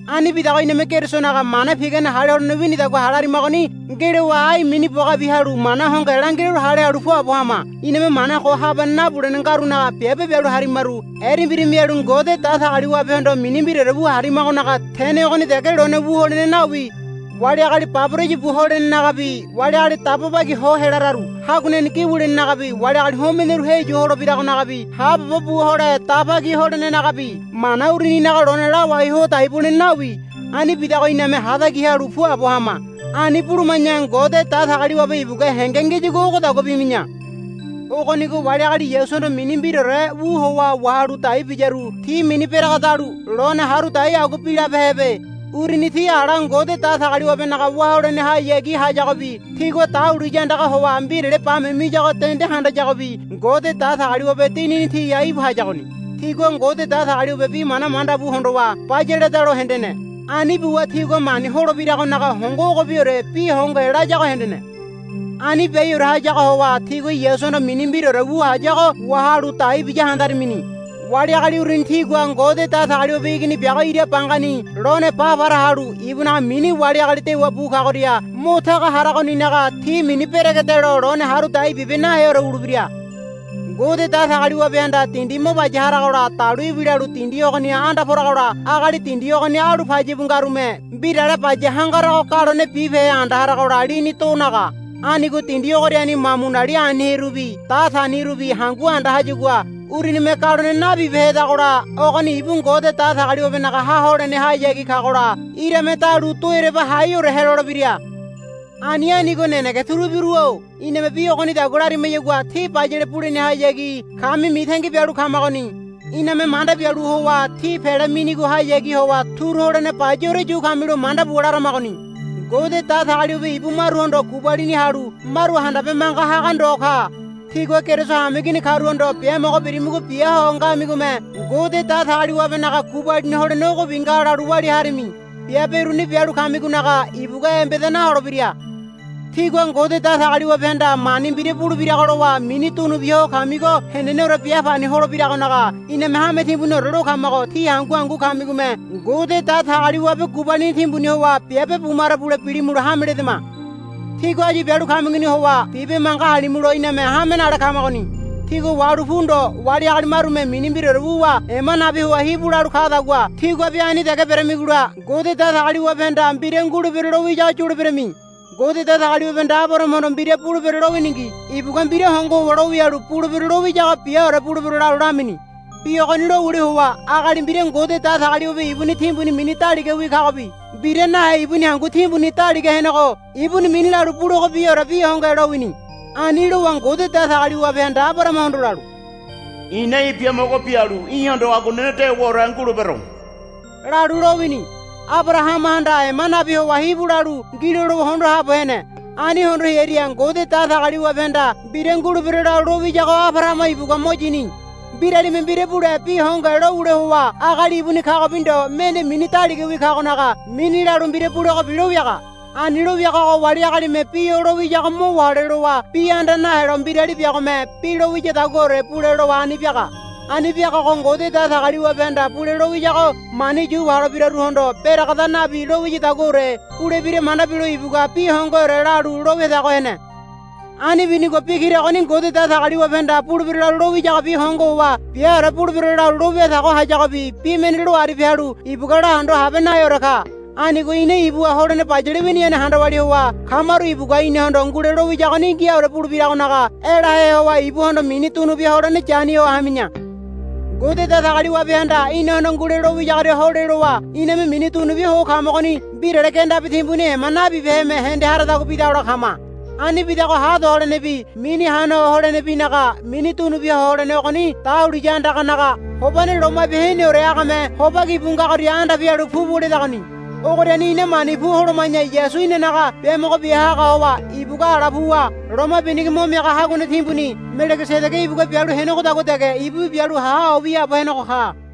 Ani bidago iname Kerisonaga mana pigane hale holene winidagua hale harimagoni ngelowa ai mini bogabi halu mana hongohe langiraru hale halu puabo hama. Iname mana ko habane nabulene ngarunaga biabe bialu harimaru erembira mialu Ngode Datagaliwabehondo mini mbiraore wu harimagonaga tene ogoni dege lone wu holene nawi. Wali agali baboraya bu holenenagabi wali agali dabo bagi ho helararu haguaneni gi wulenenagabi wali agali homeneru heyu holebiragonagabi haabobo bu hole daba ki holenenagabi mana uruninaga lone lawai ho dai bulene nawi. Ani bidago iname hatagi halu puabo hama. Ani buluma̱ya Ngode Datagaliwabe ibugua henge ngiyagua ogodagua bimi̱ya. Ogonigo wali agali Yasuhondo mini mbiraore wu howa wahalu dai biyaru ti mini beregedalu lone haru dai agua bilabehebe. Uruni ti ala Ngode Datagaliwabenaga wá holenehayagi hayagobi tigua dahuliya andaga howa mbirale bame miyago dende handayagobi Ngode Datagaliwabe Dinini tiha íbu hayagoni. Tigua Ngode Datagaliwabe bi mana manda bu hondowa bayaledalo hendene. Ani buwa tigua mani holebiragonaga hongo ogobiore bi hongohe layago hendene. Ani biaiore hayago howa tigua Yasuhondo mini mbiraore wu hayago wahalu dai biya handarimini. Wali agali uruni tigua Ngode Datagaliwabe Igini biago ira bangani lone ba para halu ibunaga mini wali agali dewa bu kagoria mo taga haragoninaga ti mini beregedelo lone haru dai bibe naheore wulebira. Ngode Datagaliwabehanda dindi mo baya haragola dalu ibilalu dindi ogoniha anda poragola agali dindi ogoni alu payabu ngarume mbirale baya hangarago galone bibehe anda haragola lini do naga. Anigo dindi ogoriani mamunali aniherubi datanirubi hangu anda hayagua urunime galone nabibehedagola ogoni ibu Ngode Datagaliwabenaga ha holenehayagi kagola irame dalu do ereba haiore helolebira. Ani anigo nenege turubiru-o iname bi ogonidagua larimayagua tí bayale bulenehayagi kami mitangi bialu kamagoni. Iname manda bialu howa tí pele minigohayagi howa turu holene bayaore yu kamilo manda buwa laramagoni. Ngode Datagaliwabe ibu maruhondo gubalini halu maru handabe manga haga ndo ka. Tígua Keriso hameigini karuhondo biamogo birimigo bia ho ngamigome Ngode Datagaliwabenaga gubalini holene ogobi nga lalu walia harimi. Biabe uruni bialu kamigonaga ibugua embeda naholebira. Tígua Ngode Datagaliwabehanda mani mbira bulebirago lowa mini dunubia ho kamigo heneneore bia pani holebiragonaga iname hame timbuniore lo kamago tí hangu hangu kamigome Ngode Datagaliwabe gubalini timbuni howa biabe bumaro bule bilimulo hame ledama. Tígua áyu bialu kamigoni howa bibe manga halimulo iname hame nale kamagoni. Tígua wahalu pu ndo wali agali marume mini mbiraore wuwa ema nabi howa hibu lalu kadagua tíguabi ani dege beramigola Ngode Datagaliwabehanda mbira ngulebero lowiyago yuleberami. Ngode Datagaliwabehanda Abarahamahondo mbira bulebero lowiningi ibugua mbira hongo howa lowialu bulebero lowiyago biaore bulebero lalu lamini. Bi ogoni lowule howa agali mbira Ngode Datagaliwabe ibuni timbuni mini daligawi kagobi mbira nahe ibuni hangu timbuni daliga henego ibuni mini lalu bulegobiore bi hongohe lowini. Ani lowa Ngode Datagaliwabehanda Abarahamahondo lalu, I̱na í̠ biamogo bialu í̠hondo aguanene dewaore ngulebero, lalu lowini. Abarahamahanda ema nabi howa hibu lalu ngilo lowa hondo haabo hene. Ani hondo hearia Ngode Datagaliwabehanda mbira ngulebero lalu lowiyago Abarahama ibugua mo yini. Mbiralime mbira bule bi hongohe lowule howa agali ibuni kagobi ndo mende mini daligawi kagonaga mini lalu mbira bulegobi lowiaga. Ani lowiagago wali agalime bi o lowiyago mo wahole lowa bi anda nahelo mbirali biagome bi lowiyadaguore bule lowa ani biaga. Ani biagago Ngode Datagaliwabehanda bule lowiyago mani yu holebiraruhondo beregeda nabi lowiyadaguore bulebira manda bilo ibugua bi hongoheore lalu lo wiatago hene. Ani binigo bi kira ogoni Ngode Datagaliwabehanda bulebero lalu lowiyagobi hongo howa biaore bulebero lalu lo wiatago hayagobi bi mende lo aribia halu ibugua lahondo habe naheore ka. Anigo ina ibuha holene bayale winiyane handa walia howa kamaru ibugua inahondo ngule lowiyagoni ngiaore bulebiragonaga elahe howa ibuhondo mini dunubia holene yani ho hami̱ya. Ngode Datagaliwabehanda inahondo ngule lowiyagoria hole lowa iname mini dunubia ho kamagoni mbirale gendabi timbuni ema nabibeheme hende haradagua bidagola kama. Ani bidago ha do holenebi mini hana ho holenebinaga mini dunubia ho holene ogoni dahuliya andaganaga Hobane Loma Bia Heneore agame hobaki bu ngagoria anda pialu pu bo ledagoni. Ogoriani ina mani pu holoma̱ya Yasu inanaga biamogo bia haga howa ibugua ala puwa loma binigo mo miaga haguane timbuni Melegesedege ibugua bialu henegodagua dege ibubi bialu ha ho wiaabo henego ka.